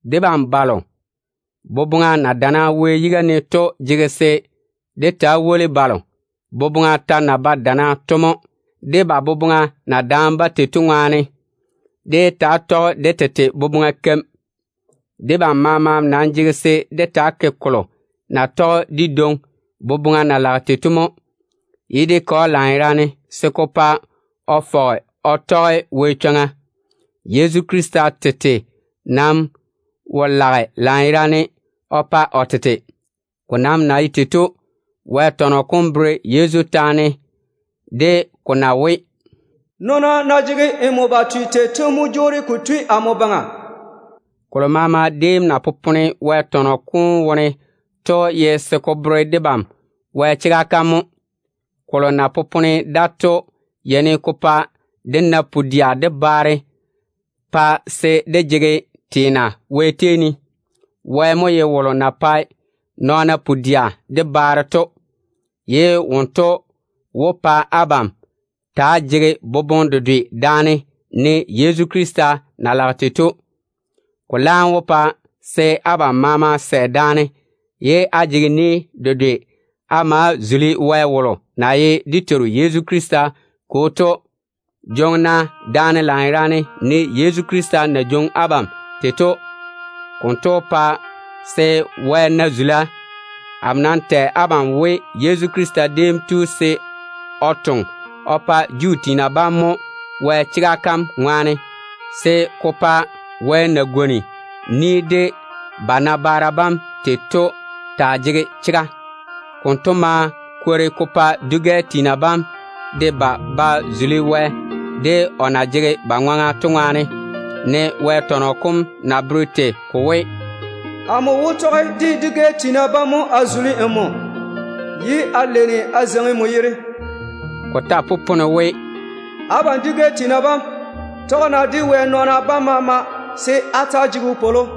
Debam balo boboŋa na dana Wɛ yiga ne to jege se dé taa woli balo boboŋa ta na ba dana to mo, de ba boboŋa na daane-ba tei to. Dé yé taa tɔge dé tete boboŋa keim. Debam maama nam jege se dé taa ke kolo na tɔge dé dwoŋi boboŋa na lage tei to mo, ye dé ke‑o lanyerane se ko pa o fɔge o tɔge Wɛ chwoŋa. Yezu Krista tete nam wo lage lanyerane o pa o tete. Ko nam na ye tei to, Wɛ tɔnɔ kom bere Yezu taane de ko na we, “Nɔɔna na jege nmo ba twea tei to mo jwoori ko tui amo baŋa.” Kolo maama déem na popone Wɛ tɔnɔ kom wone to ye se ko bere debam Wɛ chega kam mo. Kolo na popone da to yeini ko pa dé na pu-dɛa de baare, pa se dé jege teena Wɛ tei ne. Wɛ mo ye wolo na pae nɔɔna pu-dɛa de baare to, ye wonto wó pa abam taa jege boboŋe dedwe daane, ne Yezu Krista na lage tei to. Ko laam wó pa se abam maama sɛ daane ye á jege ni dedwe á ma‑á zuli Wɛ wom na ye dé Teiru Yezu Krista Kwo to. Jwoŋi-na daane lanyerane, ne Yezu Krista na jwoŋi abam tei to. Konto wó pa se Wɛ na zula. Amo nam tɛ abam we, Yezu Krista déem tu se o toŋe o pa Juu tiina bam mo Wɛ chega kam ŋwaane, se ko pa Wɛ na pwooli de ba nabaara bam tei to taa jege chega. Konto ma kwori ko pa dwi-gɛ tiina bam de ba ba zuli Wɛ, o na jege ba ŋwaŋa to ŋwaane, ne Wɛ tɔnɔ kom na bere tei ko we: “Amo wó tei nmo, se dwi-gɛ tiina taa yei n ni ne. Ko ta popone we: “Abam dwi-gɛ tiina bam, tɔge-na de Wɛ nɔɔna bam maama se á ta‑á chaka de wopwolo.”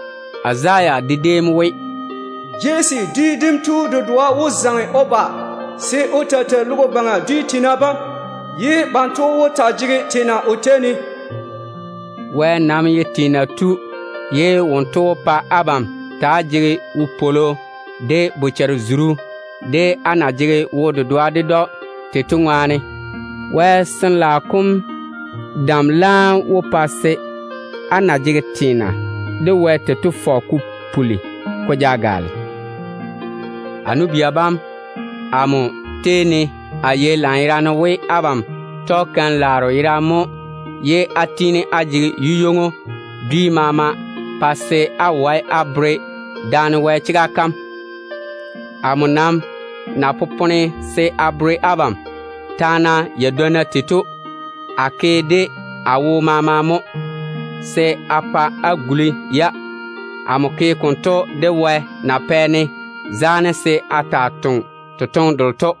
Izaya de déem we: “Jesse dwi dem tu dedoa wó zaŋe o ba se o taa tei logo baŋa teene dem, ye banto wó taa jege teena o tei ne.” Wɛ nam ye teena tu, ye wonto wó pa abam taa jege wopwolo de bochare-zuru, á na jege wo-dedoa ded‑o to ŋwaane. Wɛ Sin-laao kom dam laam wó pa se á na jege teena de Wɛ tei to fɔge ko puli ko ja gaale. A nu-bia bam, amo tei ne a yei lanyerane we abam tɔge keim-laaro yerane mo ye á tiini á jege yeino dwi maama pa se á wae á bere daane Wɛ chega kam. Amo nam na popone se a bere abam taana yadwonna tei to, a ke de a wo maama mo se a pa á guli-ya. Amo ke konto de Wɛ na pɛ-ne zaane se a taa toŋe totoŋe delo to.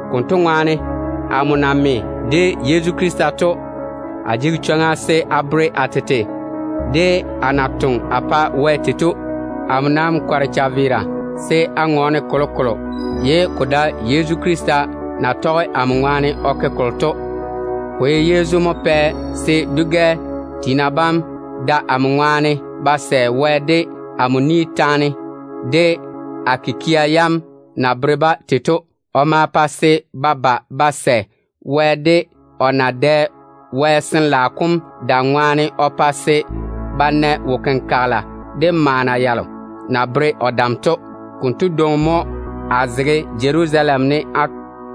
Konto ŋwaane, amo na me de Yezu Krista to, a jege chwoŋa se a bere a tete de a na toŋe a pa Wɛ tei to. Amo nam kɔre chaveera se a ŋɔɔne kolokolo ye ko dae Yezu Krista na tɔge amo baŋa ne o ke kolo to. Ko ye Yezu mo pɛ se dwi-gɛ tiina bam da amo ŋwaane ba sɛ Wɛ, de amo ni taane de a kikia yam na bere-ba tei to. O ma pa se ba ba ba sɛ Wɛ, de o na dɛ o Sin-laao kom dam ŋwaane o pa se ba na wo-kenkagela de maana yalo na bere o dam to. Konto dwoŋi mo a zege Jerusalem ne a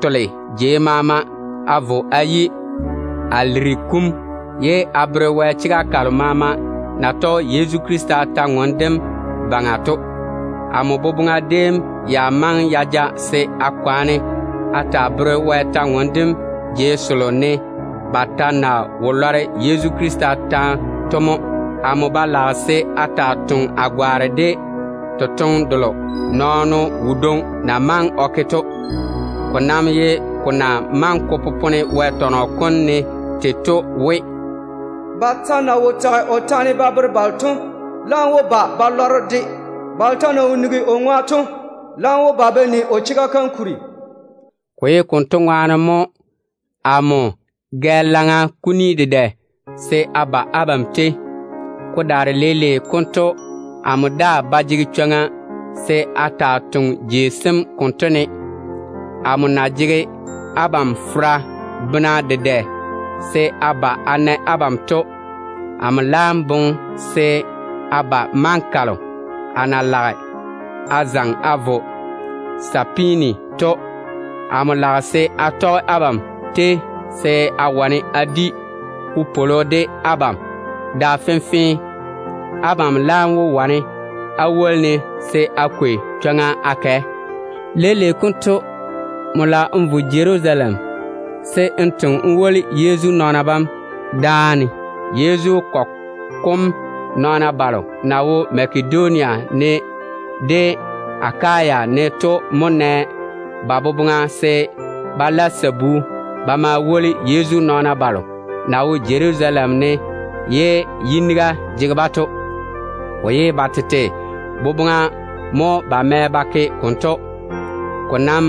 tole jei maama a vo a yi Ilirikum, ye a tiini a tɔɔle Wɛ kwor-ywoŋa kalo na bere Yezu Krista chega kam to. Amo boboŋa déem ya maŋe ya ja se a kwaane a taa tɔɔle Wɛ kwor-ywoŋa kam jei selo ne ba ta na wo lɔre Yezu Krista taane dem to mo. Amo ba lage se a taa toŋe a gwaane de totoŋe delo nɔɔno wodwoŋi na maŋe o ke to. Ko nam ye ko na maŋe ko popone Wɛ tɔnɔ kom ne tei to we: “Ba ta na wo tage o taane ba bere balo to laam wó ba ba lɔre-de. Balo ta na wo nigi o ŋwa to laam wó ba ba ni o chega kam kuri.” Ko ye konto ŋwaane mo amo gɛ laŋa kuni dedɛ se a ba abam tei. Ko daare leile konto amo daa ba jege chwoŋa se a taa toŋe jei sem konto ne. Amo na jege abam fera bena dedɛ se a ba a na abam to, amo laam boŋe se a ba maŋa kalo a na wó zaŋe a vo Sapeeni to. Amo lage se a tɔge abam tei, se a wane a di wopwolo de abam da fenfee. Abam laam wó wane á woli-ne se a kwei chwoŋa a kɛ. Leile konto amo lage a vo Jerusalem se a toŋe a woli Yezu nɔɔna bam dáane. Yezu kɔgɔ kom nɔɔna balo na wo Makedonia ne de Akaya ne to mo mɛ ba boboŋa se ba la sabu ba ma woli Yezu nɔɔna balo na wo Jerusalem ne ye yiniga jege-ba to. Ko ye ba tete boboŋa mo ba mɛ ba ke konto. Ko nam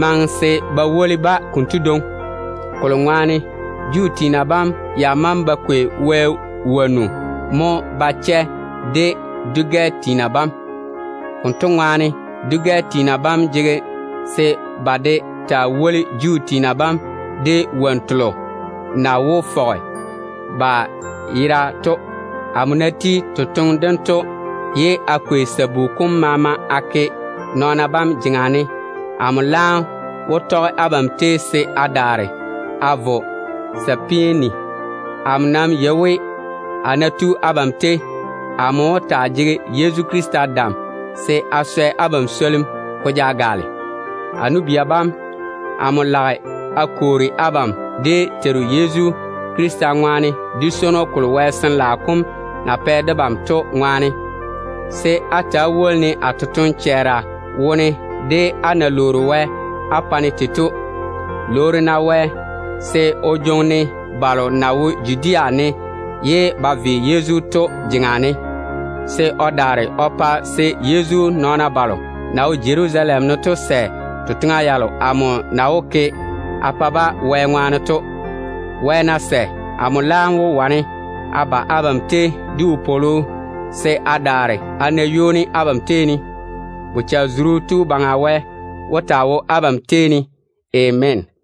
maŋe se ba woli-ba konto dwoŋi, kolo ŋwaane Juu tiina bam ya maŋe ba kwei Wɛ wo-laaro mo ba chɛ de dwi-gɛ tiina bam. Konto ŋwaane dwi-gɛ tiina bam jege se ba de daa woli Juu tiina bam de wonnu telo na wó fɔge ba yera to. Amo ná ti totoŋe dento ye a kwei sabu kom maama a ke nɔɔna bam jeŋa ne, amo laam wó tɔge abam tei se a daare a vo Sapeeni. Amo nam yei we, a ná tu abam tei, amo wó taa jege Yezu Krista dam se o swɛ abam swolim ko ja gaale. A nu-bia bam, amo lage a kwoori abam dé Teiru Yezu Krista ŋwaane, de swono kolo Wɛ Sin-laao kom na pɛ debam to ŋwaane, se á ta‑á woli-ne a totoŋ-chɛɛra wone de á na lwoori Wɛ á pa-ne tei to. Lwoori-na Wɛ se o jwoŋi-ne balo na wo Judea ne ye ba ve Yezu to jeŋa ne, se o daare o pa se Yezu nɔɔna balo na wo Jerusalem ne to sɛ totoŋa yalo amo na wó ke a pa-ba Wɛ ŋwaane to. Wɛ ná sɛ, amo laam wó wane a ba abam tei de wopwolo, se a daare a na ywoni abam tei ne. Bochare-zuru Tu Baŋa Wɛ wó taa wo abam tei ne. Ameena.